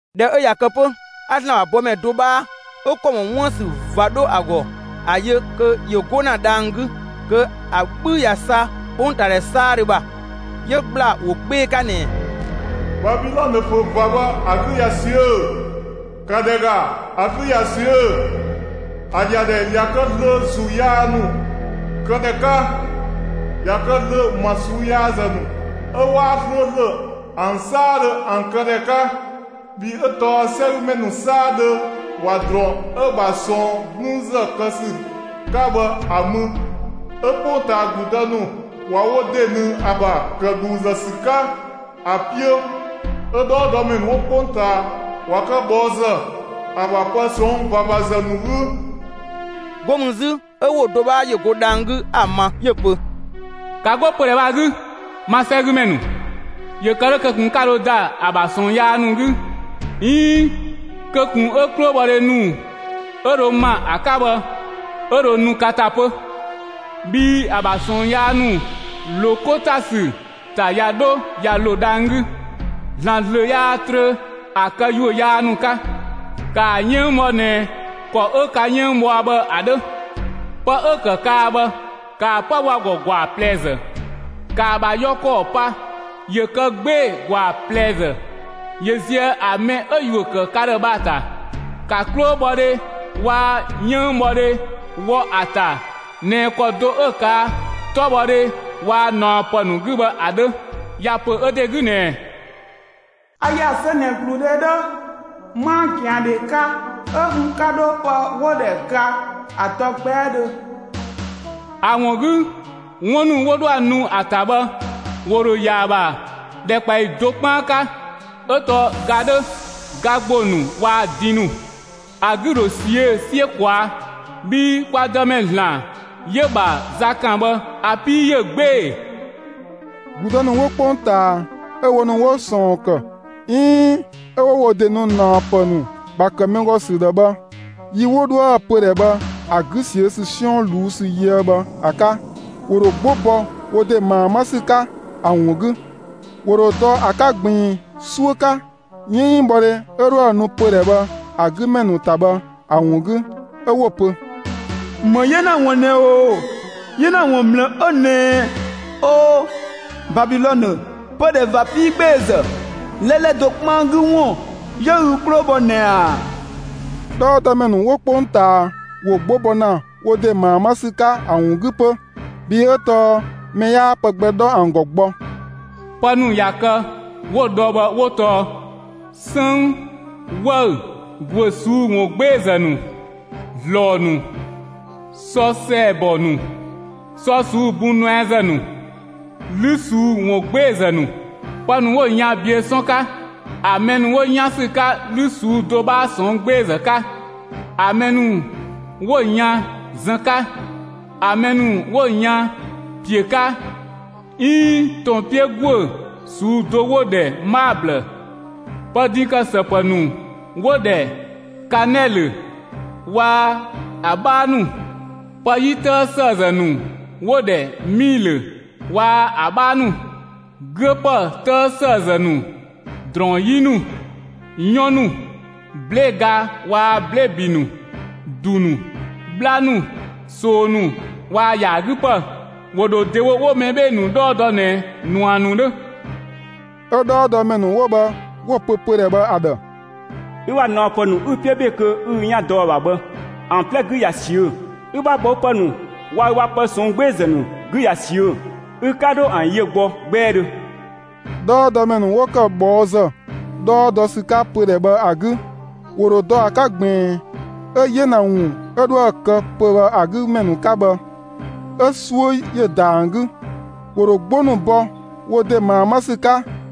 ꞊Dhɛ 'ö ꞊ya kë 'pö, 'a ‑Zlan ‑bha bɔmɛ do 'bhaa 'ö ‑kɔ ‑mɔ 'wuën‑ ‑sü ꞊va 'dho ‑a ‑gɔ 'a‑ yö kö ‑yö 'go ‑na dhang‑ 'gü kö ‑a 'bhü ꞊ya sa 'kpongtaadhɛ 'saadhö ‑bha. 'Yö ‑gbla ‑wo 'gbee‑ 'ka ꞊nɛɛ: «Babilɔnë ‑pö ꞊va bhë ‑a 'gü ꞊ya ꞊siö'‑! ‑Ka ‑dhɛ ‑ga, ‑a 'gü ꞊ya ꞊siö'‑! ‑A ‑yadhɛ ꞊ya kë zlöö ‑zuu yaa ‑nu këdhɛ 'ka. ꞊Ya kë zlöö ‑ma ꞊suu'‑ yaazë ‑nu 'ö 'waa 'slööslö ‑an 'saadhö ‑an këdhɛ 'ka. Bhii 'ö tɔɔ 'sɛgümɛ ‑nu 'saadhö ꞊wa ‑drɔɔn 'ö‑ ‑bha ꞊sɔɔn 'gblüünzë kë ‑sü 'ka bhë ‑a mü; 'ö 'kpongtaa ‑gludë ‑nu ꞊wa wo ‑de ꞊nëng ‑a ‑bha, ‑kë ‑dhuuzë ‑sü 'ka, ‑a 'piö. 'Ö 'dhɔɔdɔmɛ ‑nu 'wo 'kpongtaa ꞊wa kë ꞊bhɔɔzë, ‑a ‑bha pë ꞊sɔnng' ꞊vavazë ‑nu 'gü.» 'Go mü 'zü, 'ö ‑wo do 'bhaa ‑yö go dhang‑ 'gü 'a‑ ma, 'yö‑ pö: «‑Ka 'go pödhɛ bhë ‑a 'gü, ma 'sɛgümɛ ‑nu! ‑Yö kë 'dhö kö ꞊kun 'ka dho ‑da ‑a ‑bha ꞊sɔɔn yaa ‑nu 'gü 'iin kö ꞊kun 'ö 'klobhɔdhe ‑nu 'ö dho ‑ma ‑a 'ka bhë 'ö dho nu ka ‑ta 'pö. Bhii ‑a ‑bha ꞊sɔɔn yaa ‑nu ‑lo 'ko ‑ta ‑sü ‑ta ꞊ya 'dho ꞊ya ‑lo dhang‑ 'gü; ‑Zlan ‑zlö yaa trö ‑a këyuö yaa ‑nu 'ka. ‑Kaa 'yënng bhɔ ꞊nɛ ‑kɔ 'ö ka 'yënng bhɔa bhë ‑a 'dhö. Pë 'ö ‑kë kaa bhë, ‑kaa 'pë bho ‑a ‑gɔ ‑gwaa ꞊plɛzë. ‑Kaa ‑bha yɔ ‑kɔɔ pa ‑yö kë 'gbee‑ ‑gwaa ꞊plɛzë ‑yö ziëë ‑a mɛ 'ö‑ ‑yuö ‑kë ka ‑dhë bhë ‑a ‑ta! ‑Ka 'klobhɔdhe waa‑ 'yënngbhɔdhe wɔ ‑a ‑ta ꞊nɛ ‑kɔ do 'ö‑ ꞊kaa' 'tɔbhɔdhe waa‑ ꞊naɔpë ‑nu 'gü bhë ‑a 'dhö. ‑Ya ‑pö ö ‑de 'gü ꞊nɛɛ: ‹A ‑ya zö ꞊nɛ ‑gludhe 'dhö. 'Maa ꞊gɛandhe 'ka, 'ö n 'ka 'dho pë 'wo‑ ‑dhɛ ga ‑a dɔ 'gbɛɛdhö.› ‑A ‑wun 'gü 'wun ‑nu 'wo 'dhoë‑ nu ‑a ‑ta bhë ‑wo ‑dho ‑ya ‑a ‑bha ‑dhɛkpaɔyi do 'kpaan 'ka; 'ö tɔɔ ga 'dhö, ga ‑gbo ‑nu waa‑ din ‑nu. ‑A 'gü ‑dho ꞊siö'‑ 'siö ꞊kwaa'. Bhii kwa Dëmɛ ‑Zlan 'yö‑ ‑bha za kan bhë ‑a 'pii ‑yö 'gbee‑. ‑Gludë ‑nu 'wo 'kpongtaa 'ö wo ‑nu 'wo ꞊sɔɔn ‑kë 'iin 'ö 'wo wo ‑de nu ꞊naɔpë ‑nu ‑bha ‑kë mɛ ‑gɔ ‑sü ‑dhë bhë, yi 'wo 'dhoë‑ pödhɛ bhë ‑a 'güö ‑sü 'siɔn ꞊luu'‑ ‑sü yöë bhë ‑a 'ka, ‑wo ‑dho 'gbo bɔ wo ‑de ꞊maa 'ma ‑sü 'ka ‑a ‑wun 'gü. ‑Wo ‑dho dɔ ‑a 'ka ꞊gbiin 'suö 'ka, 'yënngbhɔdhe 'ö 'dhoë‑ nu pödhɛ bhë ‑a 'gü ‑mɛ ‑nu ‑ta bhë ‑a ‑wun 'gü, 'ö 'wo‑ pö: ‹‑Më 'yena ‑wun ꞊nɛ ‑oo! 'Yena ‑wun ‑mlë 'ö ꞊nɛɛ! O, Babilɔnë, pödhɛ ꞊va 'piigbeezë! 'Lɛlɛ do 'kpaan 'gü ‑wun 'yö ü 'klo bhɔ ꞊nɛ ꞊a!› 'Dhɔɔdɔmɛ ‑nu 'wo 'kpongtaa ‑wo 'gbo bɔ ‑na wo ‑de ꞊maa 'ma ‑sü 'ka ‑a ‑wun 'gü 'pö, bhii 'ö tɔɔ mɛ 'yaa pë gbɛ 'dhɔ ‑an ‑gɔ gbɔ. Pë ‑nu ꞊ya kë 'wo‑ dhɔ bhë 'wo tɔɔ: 'Sënng, 'wëü‑, ‑güö ꞊suu'‑ ‑wungbeezë ‑nu, ‑zlɔɔ ‑nu, sɔ ‑sɛɛbɔ ‑nu, sɔ ꞊suu'‑ bun nuɛazë ‑nu, 'lü ꞊suu'‑ ‑wungbeezë ‑nu, pë ‑nu 'wo‑ yan biö 'sɔn 'ka, ‑a mɛ ‑nu 'wo 'yan ‑sü 'ka 'lü ꞊suu'‑ do 'bhaa ꞊sɔnng' 'gbeezë 'ka, ‑a mɛ ‑nu 'wo‑ yan zën 'ka, ‑a mɛ ‑nu 'wo‑ yan ‑piö 'ka 'iin ‑tɔn 'piö ‑guö ꞊suu'‑ do 'wo‑ ‑dhɛ 'maablë, pë din ‑kë ‑së ‑pë ‑nu 'wo‑ ‑dhɛ kanɛlö waa‑ ‑a 'bhaa ‑nu; pë 'yi 'tëë ‑sëëzë ‑nu 'wo‑ ‑dhɛ 'miilö waa‑ ‑a 'bhaa ‑nu, 'güö ‑pë 'tëë ‑sëëzë ‑nu, ‑drɔɔn 'yi ‑nu, 'yɔn ‑nu, 'blee‑ ga waa‑ 'blee‑ ‑bi ‑nu, ‑du ‑nu, 'bhla ‑nu, ꞊soo ‑nu waa‑ ‑yaa 'gü ‑pë, ‑wo ‑dho ‑dewo 'wo mɛ 'bhee‑ ‑nu 'dhɔɔ dɔ ꞊nɛ ꞊nua ‑nu 'dhö. 'Ö 'dhɔɔdɔmɛ ‑nu 'wo bhë 'wo‑ pö pödhɛ bhë ‑a ‑dhë: ‹Ü ‑bha ꞊naɔpë 'ü‑ 'piö ‑be kö 'ü ü 'yan dɔ ‑a ‑bha bhë ‑an 'plɛ 'gü ꞊ya ꞊siö'‑; ü ‑bha ꞊bhɔɔpë ‑nu waa‑ ü ‑bha pë ꞊sɔnng' 'gbeezë ‑nu 'gü ꞊ya ꞊siö'‑! Ü 'ka 'dho ‑an yö gbɔ 'gbɛɛdhö!› 'Dhɔɔdɔmɛ ‑nu 'wo ‑kë ꞊bhɔɔzë 'dhɔɔ dɔ ‑sü 'ka pödhɛ bhë ‑a 'gü, ‑wo ‑dho dɔ ‑a 'ka ꞊gbiin 'ö 'yena ‑wun 'ö 'dhoë‑ kë pö‑ bhë ‑a 'gü ‑mɛ ‑nu 'ka bhë, 'ö‑ 'suö ‑yö ‑da ‑an 'gü. ‑Wo ‑dho 'gbo ‑nu bɔ wo ‑de ꞊maa 'ma ‑sü 'ka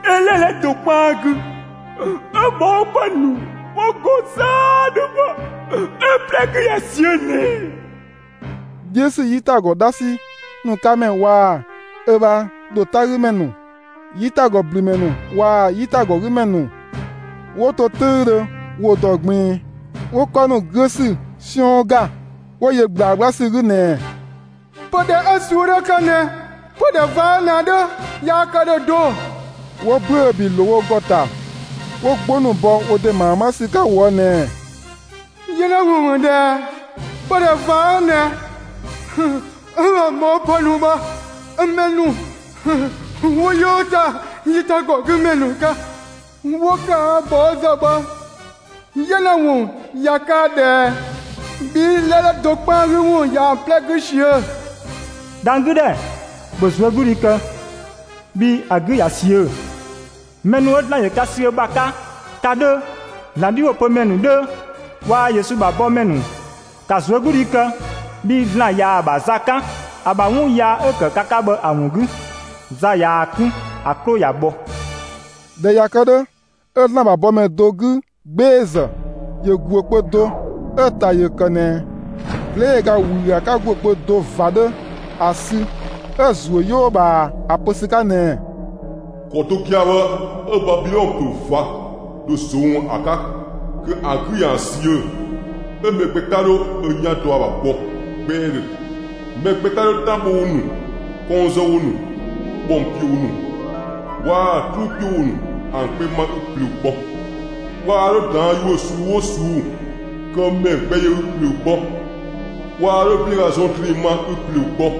'Ö 'lɛlɛ do 'kpaan 'gü, 'ö ꞊bhɔɔpë ‑nu 'wo‑ ‑gɔ 'saadhö bhë, 'ö‑ 'plɛ 'gü ꞊ya ꞊siö ꞊nɛ ꞊a!› 'Dhiö ‑sü 'yitagɔ 'dhasi ‑nu 'ka ‑mɛ waa‑ ö bha ‑dho 'tagümɛ ‑nu, 'yitagɔblümɛ ‑nu waa‑ 'yitagɔgümɛ ‑nu 'wo to 'töüdhö ‑wo ‑dɔ ꞊gbiin, 'wo 'kɔ ‑nu 'güö ‑sü 'siɔn ‑ga; 'wo yö ꞊gblaa 'gbla ‑sü 'gü ꞊nɛɛ: ‹Pödhɛ 'ö‑ ꞊suu'‑ dho kë ꞊nɛ pödhɛ ꞊va 'ö ꞊nɛ ‑a 'dhö yaa kë ‑dhö do!› 'Wo ‑büö ‑bi ‑nu ‑lo wo ‑gɔ ‑ta, 'wo 'gbo ‑nu bɔ wo ‑de ‑maa 'ma ‑sü 'ka ꞊woë' ꞊nɛɛ: ‹'Yena ‑wun ‑mü ꞊dhɛ ꞊ɛ! Pödhɛ ꞊va 'ö ꞊nɛ 'ö‑ ‑bha ꞊bhɔɔpë ‑nu bhë 'ö mɛ ‑nu 'wo 'yoo ‑ta 'yitagɔgümɛ ‑nu 'ka 'wo ꞊kaa' ꞊bhɔɔzë bhë 'yena ‑wun ꞊ya kaa ꞊dhɛ ꞊ɛ! Bhii 'lɛlɛ do 'kpaan 'gü ‑wun ꞊yaa‑ 'plɛ 'gü ꞊siö'‑! Dhang‑ 'gü ‑dhɛ, ‑bhö ꞊zuögludhi kë, bhii ‑a 'gü ꞊ya ꞊siö'‑; mɛ ‑nu 'ö ‑Zlan ‑yö ka sü ö ‑bha 'ka, ka 'dhö, ‑Zlan 'dhiwopömɛ ‑nu 'dhö, waa‑ Yesu ‑bha bɔ ‑mɛ ‑nu, ‑ka ꞊zuögludhi kë, bhii ‑Zlan ꞊ya ‑a ‑bha za 'kan, ‑a ‑bha 'wun yaa 'ö‑ ‑kë ka 'ka bhë ‑a ‑wun 'gü. Za ꞊yaa‑ 'kun, ‑a 'klo ꞊ya bhɔ.›» ꞊Dhɛ ꞊ya kë 'dhö, 'ö ‑Zlan ‑bha bɔmɛ do 'gü 'gbeezë ‑yö ‑guö kpö do 'ö‑ ‑ta ‑yö ‑kë ꞊nɛ 'blee‑ ga ‑wüü ‑a 'ka ‑guö kpö do ꞊va 'dhö ‑a sü 'ö‑ ‑zuö 'yoo ꞊bhaa ‑a pö ‑sü 'ka ꞊nɛɛ: «‑Kɔ do gia‑ 'ö ꞊nɛ 'ö Babilɔnë ‑pö ꞊va dho ꞊zong'‑ ‑a 'ka kö ‑a 'gü ‑yaan ꞊siö'‑. 'Ö mɛ gbɛ 'ka 'dho ö 'yan dɔ ‑a ‑bha gbɔ 'gbɛɛdhö. Mɛ gbɛ 'ka 'dho 'tan bho ‑wo ‑nu, kɔng zë ‑wo ‑nu, ‑bhɔng ‑piö ‑wo ‑nu waa‑ 'truu ‑piö ‑wo ‑nu ‑an gbɛ ma ü ꞊plöö gbɔ. Waa 'dho ꞊daan' ‑yuö ꞊suu'‑ 'oo ꞊suu'‑ kë ‑mɛ gbɛ yö ü ꞊plöö gbɔ. Waa 'dho 'blee‑ ga zɔn ‑drinng ma ü ꞊plöö gbɔ.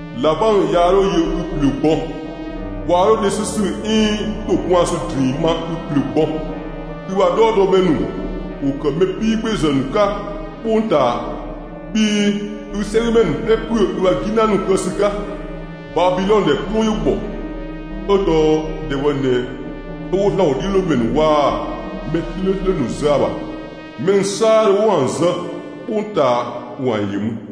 ꞊Labang yaa 'dho yö ü ꞊plöö gbɔ. Waa 'dho dhe 'sü ‑sü 'iin ‑dho gwaan ‑sü ‑drinng ma ü ꞊plöö gbɔ. Ü ‑bha 'dhɔɔdɔmɛ ‑nu ‑wo ‑kë mɛ 'piigbeezë ‑nu 'ka 'kpongtaa, bhii ü 'sɛgümɛ ‑nu 'plɛ ‑püö ü ‑bha 'gina ‑nu kë ‑sü 'ka. Babilɔnë ‑dhɛ 'klo ‑yö ‑bhɔ, 'ö tɔɔ ‑dhɛ bhë ꞊nɛ 'ö 'wo ‑Zlan ‑wodhiölomɛ ‑nu waa‑ mɛ 'slööslö ‑nu zë ‑a ‑bha. Mɛ ‑nu 'saadhö 'wo ‑an zë 'kpongtaa, ‑wo ‑an ‑yö mü.»